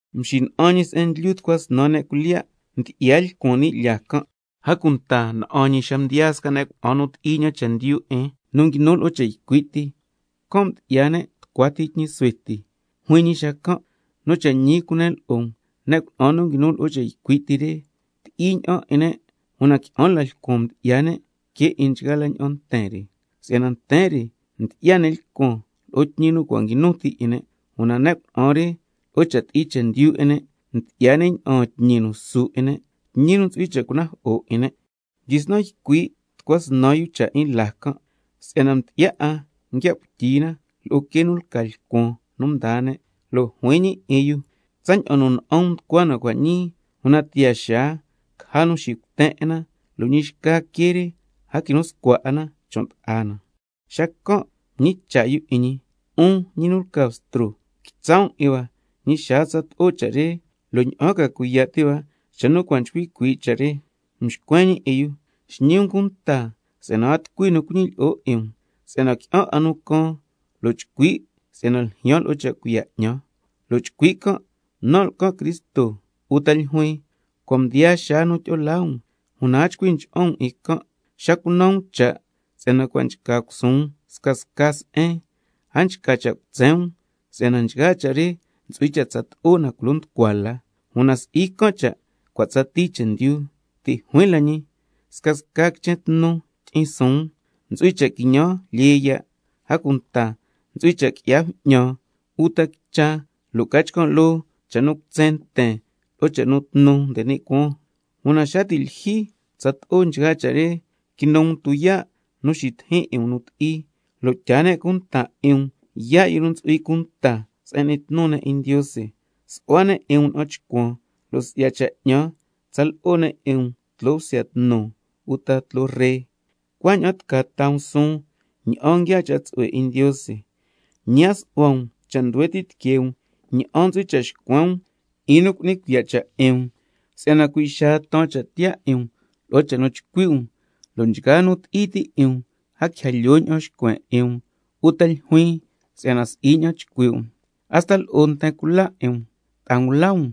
Mxina'an ñi se'en ndlyu tucua snan ne' cuilyiya' ndyi'ya lcuan ni' lyaa can'. A cunta na'an ñi xa mdiyaa sca ne' cuna'an nu ti'i ña'an chendyu 'in nu nguinu lo'o cha' ycui' ti, can' mdyi'ya ne' tucua ti tñi suhue ti. Juin ñi xacan': Nu cha' ñi cunen lo'o um, ne' cuna'an nu nguinu lo'o cha' ycui' ti re, ti'i ña'an 'in ne', una qui'an la lcuan mdyi'ya ne' que 'in nchgaa la ña'an nten re. Si'yana nten re mdyi'ya ne' lcuan lo'o tñi nu cua' nguinu ti 'in ne', una ne' cuna'an re, lo'o cha' ti'i chendyu 'in ne' mdyi'ya ne' ña'aan tñi nu su 'in ne', tñi nu ntsu'hui cha' cunajo'o 'in ne'. Mdyisnan ycui' tucua snan yu cha' 'in laa can', si'yana ndyi'ya 'a nguia' cuityi na lo'o quee nu lca lcuan nu mdaa ne', lo' juin ñi 'in yu: Tsaña'an nu na'an um nducua na cua' ñii, una tiyaa xaa caja nu xicuten 'in na, lo' ñi xca quee re a quinu scua 'a na chon' ta'a na. Xacan' mñicha' yu 'in ñi: 'Un ñi nu lca Bstro, quitsa' um 'in hua ñi xaa tsato'o cha' re, ¿lo' ña'an ca cuiya' ti' hua xa nu cua' nchcui cuii' cha' re? Mxcuen ñi 'in yu: Xñi um cunta si'yana a tucui nu cuñilyi'o 'in um, si'yana qui'an 'a nu caan lo' chcui' si'yana ljyaan lo'o cha' cuiya' 'ñan, lo' chcui' can': Nan' lcan Cristo, uta ljuin: Cua' mdiyaa xaa nu tyi'o laa um. Una a chcui ncha'an um 'in can'. Xa cunan um cha' si'yana cua' nchca cusuun scasca se'en, a nchca cha' cutsen um si'yana nchgaa cha' re ntsu'hui cha' tsato'o na culo nducua la, una si'i can' cha' cua' tsatii chendyu. Ti' juin la ñi: Scasca quichen tnu tyi'in suun, ntsu'hui cha' quiñan lyee ya', a cunta scasca se'en ntsu'hui cha' qui'ya bju'ñan uta quicha, lo' ca chcan' loo cha' nu cutsen nten lo'o cha' nu tnu nde ni' cuaan. Una xa ti' lyijyi tsato'o nchgaa cha' re, ntsu'hui cha' quinu um tuyaa' nu xitijin 'in um nu ti'i, lo' tyaa ne' cunta 'in um yaa' yu nu ntsu'hui cunta se'en n'ni tnu ne' 'in Ndiose, su'hua ne' 'in um na'an chcuan, lo' si'ya cha' 'ñan tsa lo'o ne' 'in um tloo bsya tnu uta tloo ree, cuaña'an tca taa um suun ña'an nguiaa cha' tsu'hue 'in Ndiose. Ñi a su'hua um cha' nduhue ti' tiquee um ña'an ntsu'hui cha' xcuen um 'in nu cu'ni cuiya' cha' 'in um, si'yana cui' xacan' taan cha' tiyaa 'in um lo'o cha' nu chcui' um, lo' nchgaa nu ti'i ti' 'in um a quija lyoo ña'an xcuen 'in um uta ljuin si'yana si'i ña'an nchcui' um. Hasta lo'o nten cula 'in um, ta'a ngula um,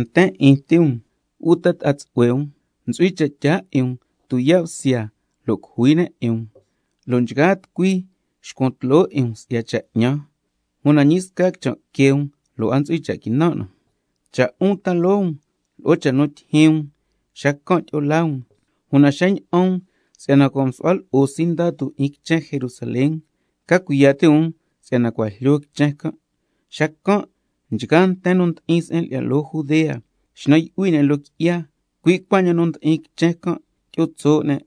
nten 'in ti um, uta ta'a tsu'hue um ntsu'hui cha' tyaa 'in um yaa' bsya, lo' ntsu'hui um caja nu cujui 'in um, lo' nchgaa tucui xcuan tloo 'in um si'ya cha' 'ñan. Una ñi sca quichan' que um lo' a ntsu'hui cha' quinan' na. Cha' 'un ta loo um lo'o cha' nu ljyaan 'in um, xacan' tyi'o laa um. Una xa ña'an um si'yana cua' msu'hua lo'o sindatu 'in quichen Jerusalén, ca cuiya' ti' um si'yana cua' jlyo quichen can'. Xacan' nchgaa nten nu ndi'in se'en lyi'ya loo Judea xnan yu'hui ne' loo qui'ya, cui' cuaña'an nu ndi'in quichen can' tyi'o tso' ne',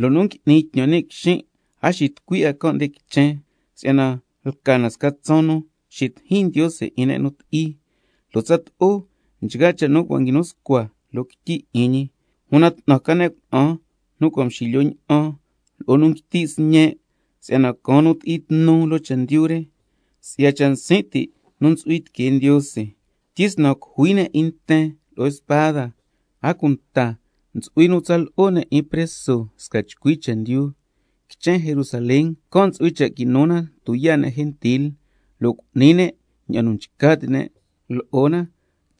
lo' nu ngui'ni tñan ni' quixin' a xitucui 'a can' nde quichen. Si'yana lca na sca tsaan nu xitijin Ndiose 'in ne' nu ti'i, lo' tsato'o nchgaa cha' nu cua' nguinu scua loo quityi 'in ñi. Una 'tnan ca ne' cuna'an nu cua' mxilyo ña'an, lo'o ne' nu nguiti' sñe' xacan', si'yana caan nu ti'i tnu loo chendyu re, si'ya cha' nsin' ti' nu ntsu'hui tiquee Ndiose. Tyisnan cujui ne' 'in nten lo'o spada, a cunta ntsu'hui nu tsa lo'o ne' 'in preso sca chcui chendyu, quichen Jerusalén can' ntsu'hui cha' quinu na tuyaa' ne' gentil, lo' cu'ni ne' ña'an nu nchca ti' ne' lo'o na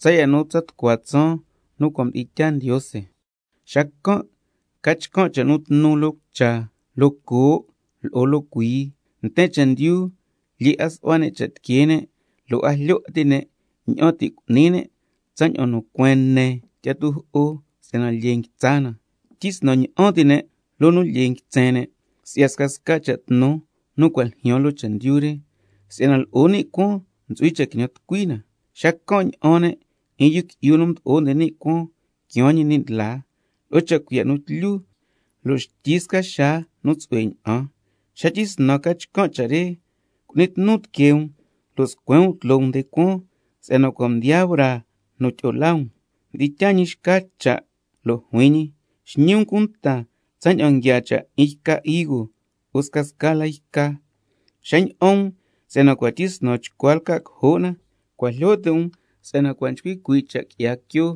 tsaya' nu tsa tucua tsaan nu cua' mdi'in tyaa Ndiose. Xacan' ca chcan' cha' nu tnu loo cucha, loo coo', lo'o loo cuii, nten chendyu lyee 'a su'hua ne' cha' tiquee ne', lo' a jlyo 'a ti' ne' ña'an ti' cu'ni ne' tsaña'an nu cueen ne tyi'a tujo'o si'yana lyee nguitsa na, tyisnan ña'an ti' ne' loo nu lyee nguitsen ne', si'ya scasca cha' tnu nu cua' ljyaan loo chendyu re, si'yana —lo'o ni' cuaan ntsu'hui cha' quiñan tucui na—. Xacan' ña'an ne' 'in —Yu Qui'yu nu Mdo'o nde ni' Cuaan quiaan ñi ni' ndlaa— lo'o cha' cuiya' nu tlyu, lo' xtyi sca xaa nu tsu'hue ña'an. Xa tyisnan ca chcan' cha' re, cu'ni tnu tiquee um lo' scuen um tloo um nde cuaan, si'yana cua' mdiyaa braa nu tyi'o laa um. Mdi'in tyaa ñi xca cha' lo' juin ñi: Xñi um cunta tsaña'an nguiaa cha' 'in yca higo lo'o scasca la yca, xa ña'an um si'yana cua' tyisnan chcua lca' cojo' na, cua' jlyo ti' um si'yana cua' nchcui cuii' cha' quila quio.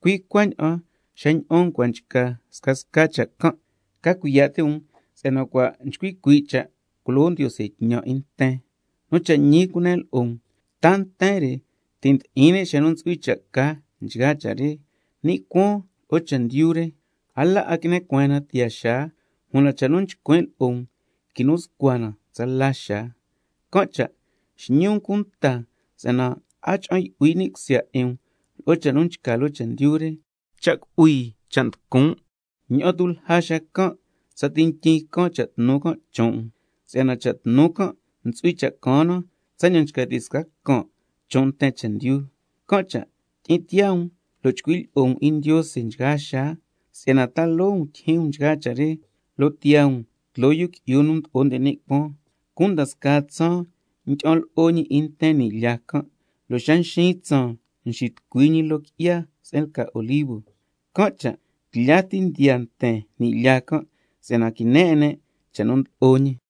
Cui' cuaña'an 'un xa ña'an um cua' nchca scasca cha' can', ca cuiya' ti' um si'yana cua' nchcui cuii' cha' nu culo Ndiose tñan 'in nten. Nu cha' ñi cunen lo'o um, ta nten re ti' ndi'in ne' xa nu ntsu'hui cha' ca nchgaa cha' re. Ni' cuaan lo'o chendyu re, a la 'a quine cueen na tiyaa xaa, una cha' nu nchcuin' lo'o um quinu scua na tsala xaa. Can' cha' xñi um cunta si'yana a cha'an yu'hui ni' cusya 'in um lo'o cha' nu nchca loo chendyu re, cha' cu'hui, cha' tucun', ña'an tu' lja xacan' tsati ntyin caan cha' tnu can' chon' um. Si'yana cha' tnu can' ntsu'hui cha' caan na tsaña'an nchca ti' sca can' chon' nten chendyu. Can' cha' tyi'in tiyaa um lo' chcui' lyi'o um 'in Ndiose nchgaa xaa si'yana ta loo um tyijyin um nchgaa cha' re, lo' cuaña'an tiyaa um tloo Yu Qui'yu nu Mdo'o nde ni' Cuaan. Cunda scaa tsaan ndyi'an lo'o ñi 'in nten ni' lyaa can', lo' xa nxiin tsaan nxitucui ñi nde loo qui'ya se'en lca Olivo. Can' cha' tlya ti ndiyaa nten ni' lyaa can', si'yana quine 'in ne' cha' nu ndlo'o ñi.